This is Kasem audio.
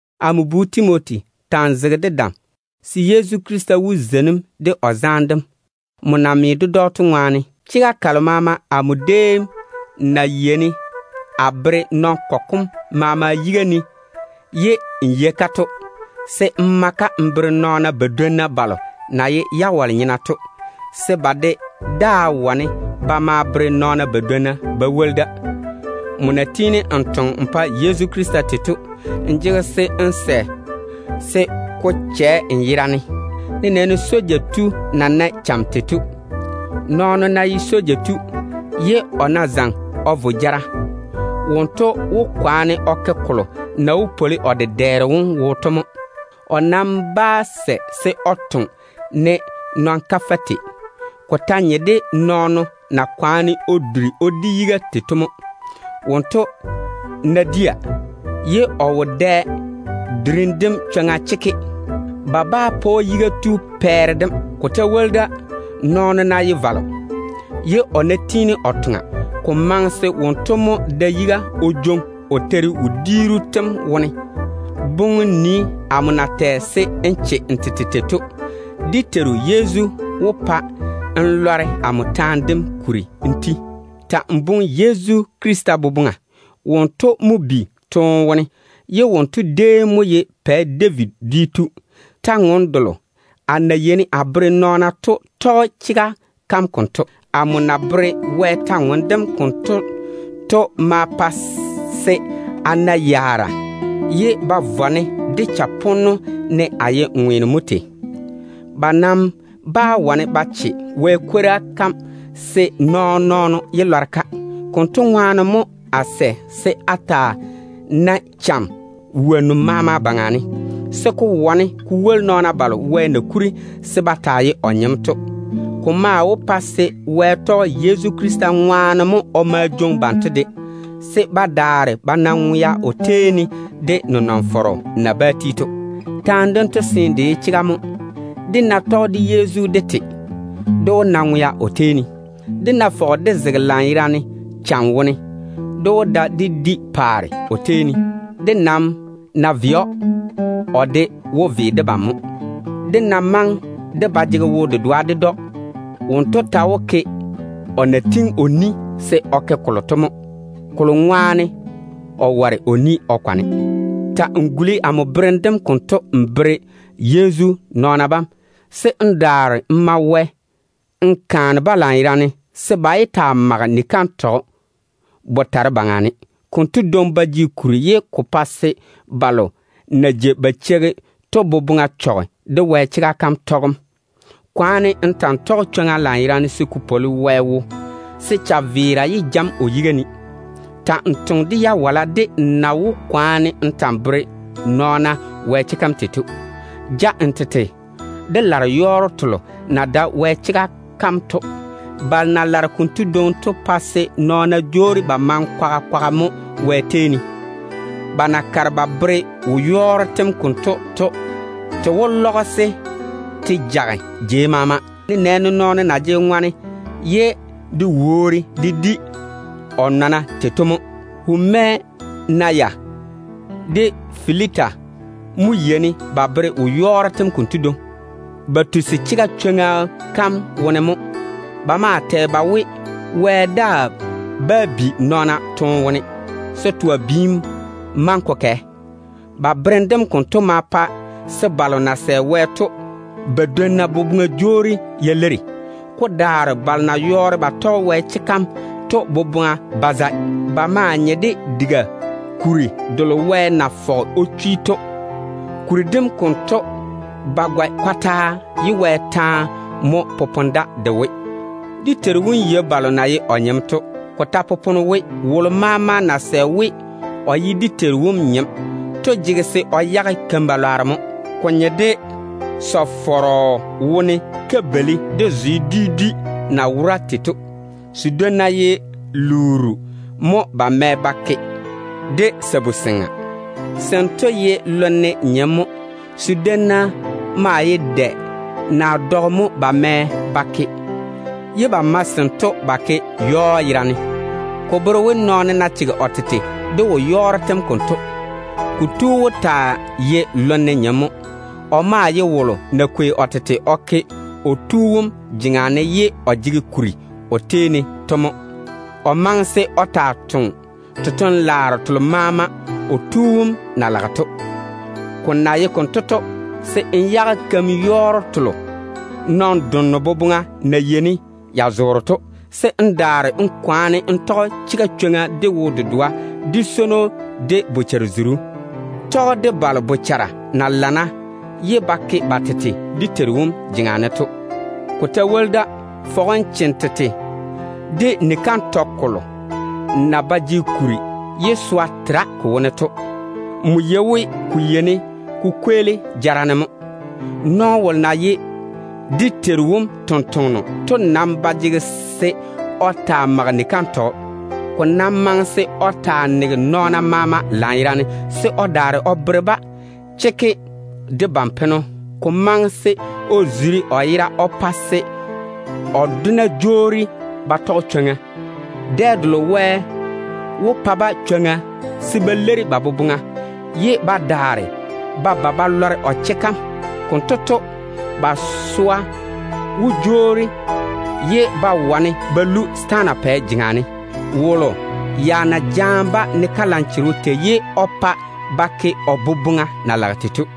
Amo bu Timoti, ta‑n zege de dam, se Yezu Krista wó zeini‑m de o zaane dem, nmo na me ded‑o to ŋwaane. Chega kalo maama amo déem na yeini a bere nɔn-kɔgɔ kom maama yiga ne ye n yei-ka to, ma-ka n bere nɔɔna badwonna balo na ye jawale-nyena to, se ba de daa wane ba maa bere nɔɔna badwonna. Nmo na tiini n toŋe n pa Yezu Krista tei to, ta ta‑n toŋa se ko chɛ n yera ne, nenɛɛne soja tu na nae cham tei to mo. Nɔɔno ná ye soja tu, ye o ná zo jara wo, wonto wó kwaane o ke kolo na wó su o dedɛɛro wom yi to mo. O nam bá sɛ se o toŋe ne nɔn-kafɛ tei. Ko ta nye de nɔɔno na kwaane o duri o di yiga tei to mo. Wonto ná dia, ye o wo dɛ durim dem chwoŋa chekke, ba bá sɛ ba pa‑o yiga tu pɛɛre dem. Ko ta woli da, nɔɔno ná ye valo, ye o ná tiini o toŋa, ko maŋe se wonto mo da yiga o jwoŋi o teiri wodiiru tem wone. Boŋe n nii amo na tɛ se n che n tete tei to. Dé Teiru Yezu wó pa n lɔre amo taane dem kuri n ti. Ta‑n boŋe Yezu Krista boboŋa. Wonto mo bi toone wone. O déem mo ye Pɛ David dwi tu. Kwor-ywoŋa kalo a na yeini a tɔɔle to bere kam konto. Amo na tɔɔle Wɛ kwora kam konto to mo tei a wo yaara wone, ye ba vɔ-ne de chaponno ne a ye ŋweeno mo tei. Ba nam bá wane ba che Wɛ kwora kam se nɔɔn-nɔɔno yé lɔre-ka. Konto ŋwaane mo a sɛ se a taa nae cham wonnu maama baŋa ne, se ko wane ko woli nɔɔna balo Wɛ na kuri se ba taa ye o nyem to. Ko maa wó pa se Wɛ tɔge Yezu Krista ŋwaane mo o ma jwoŋi banto de, se ba daare ba na ŋwea o tei ne, de nenɔŋ-fɔrɔ na bá ti to. Taane dento seene de ye chega mo: Dé ná tɔge de Yezu dé te, dé wó na ŋwea o tei ne. Dé ná fɔge dé zege lanyerane cham wone, dé wó da dé di paare o tei ne. Dé nam ná ve‑o, o de wó ve debam mo. Dé ná maŋe dé ba jege o chega, wonto ta wó zege o chega wone mo, kolo ŋwaane o ware se o jwoori o tete kwaga ne. Ta‑n guli amo berem dem konto n bere Yezu nɔɔna bam, se n daare n ma Wɛ n kaane-ba lanyerane se ba yé taa mage ni-kantɔgɔ botare baŋa ne. Kantɔgɔ konto dwoŋi ba jege kuri, ye ko pae se balo na jei ba cheigi-ko to boboŋa chɔge Wɛ chega kam tɔgem seeni. Kwaane n ta‑n tɔge chwoŋa lanyerane se ko su Wɛ yi, se chaveera yé ja‑m o yiga ne. Ta‑n toŋe de jawala de n na wó kwaane n ta‑n bere nɔɔna Wɛ chega kam tei to. Ja n tete de lare-yɔɔro telo na dae Wɛ chega kam to. Balo na lare konto dwoŋi to pae se nɔɔna jwoori ba maŋe kwaga kwaga mo Wɛ tei ne. Ba na kare ba bere wo-yɔɔro tem konto to, te lɔgese te jage jei maama, nenɛɛne nɔɔno na jege ŋɔne ye de woori de di o yera tei to mo. Humenaya de Fileta mo yeini ba bere wo-yɔɔro tem konto dwoŋi. Ba tusi chega chwoŋa kam wone mo. Ba maa tɛ ba we, Wɛ daa bá bi nɔɔna toone wone, se twa biim maŋe ko kɛ. Ba berem dem konto ma pa se balo na sɛ Wɛ to badwonna boboŋa jwoori ya leiri. Ko daare balo na yɔɔre ba tɔge Wɛ chega kam to boboŋa ba zae. Ba maa nye de kabiri-beira kalo Wɛ na fɔge o chwi to. Ka maa ba gɔe kɔtaa, ye Wɛ taane mo popone ka yera ne we: “Dé Teiru wom yei balo na ye o nyem to.” Ko ta popone we: “Wolo maama na sɛ we o ye dé Teiru wom nyem to jege se o yage keim-lwanno mo.” Ko nye de sɔ-fɔrɔ wone kabeili de zwe dwi dwi na wora tei to. Sedwonna ye lu-nyenno naa sabu-seŋa mo ba mɛ ba ke. Sento ye lonne nyem mo. Sedwonna maa ye dɛ naa dɔgɔ mo ba mɛ ba ke, ye ba mae sento yɔɔ yerane. Ko bere we, nɔɔno ná chege o tete de wo-yɔɔro tem konto, kotu wó taa ye lonne nyem mo. O maa ye wolo na kwei o tete o ke o tu wom jeŋa ne pa se o jege kuri o pa‑o to mo. O maŋe se o taa toŋe totoŋ-laaro telo maama o tu wom na lage to. Ko na ye konto to, se n yage keim-yɔɔro telo nɔn-donno boboŋa na yeini ya zoore to, se n daare n kwaane n tɔge chega chwoŋa, de wo-dedoa, de swono, de bochare-zuru. Ta‑n vei de balo bochara na lana ye ba ke ba tete dé Teiru wom jeŋa ne to. Ko ta woli da, fɔge n che n tete de ni-kantɔgɔ kolo maama na ba jege kuri ye swa tere ko wone to. Nmo yei we ko yeini ko kweeli jara ne mo. Nɔɔno wolo na ye dé Teiru wom tontoŋeno to nam ba jege se o taa mage ni-kantɔgɔ. Ko nam maŋe se o taa nege nɔɔna maama lanyerane, se o daare o bere-ba chekke de ban-peno. Ko ta maŋe se o zuri o yera o pa se balo na dwoni ded-o to jwoori ba tɔge chwoŋa. Dɛ delo Wɛ wó pa-ba chwoŋa se ba leiri ba boboŋa, ye ba daare ba ba ba lɔre o chega kam. Konto to, ba swa wó jwoori pa se ba wane ba lu setaana pɛ jeŋa ne. Wonto ya jaane-ba ne kalanchogo tei, ye o pa ba ke o boboŋa na lage tei to.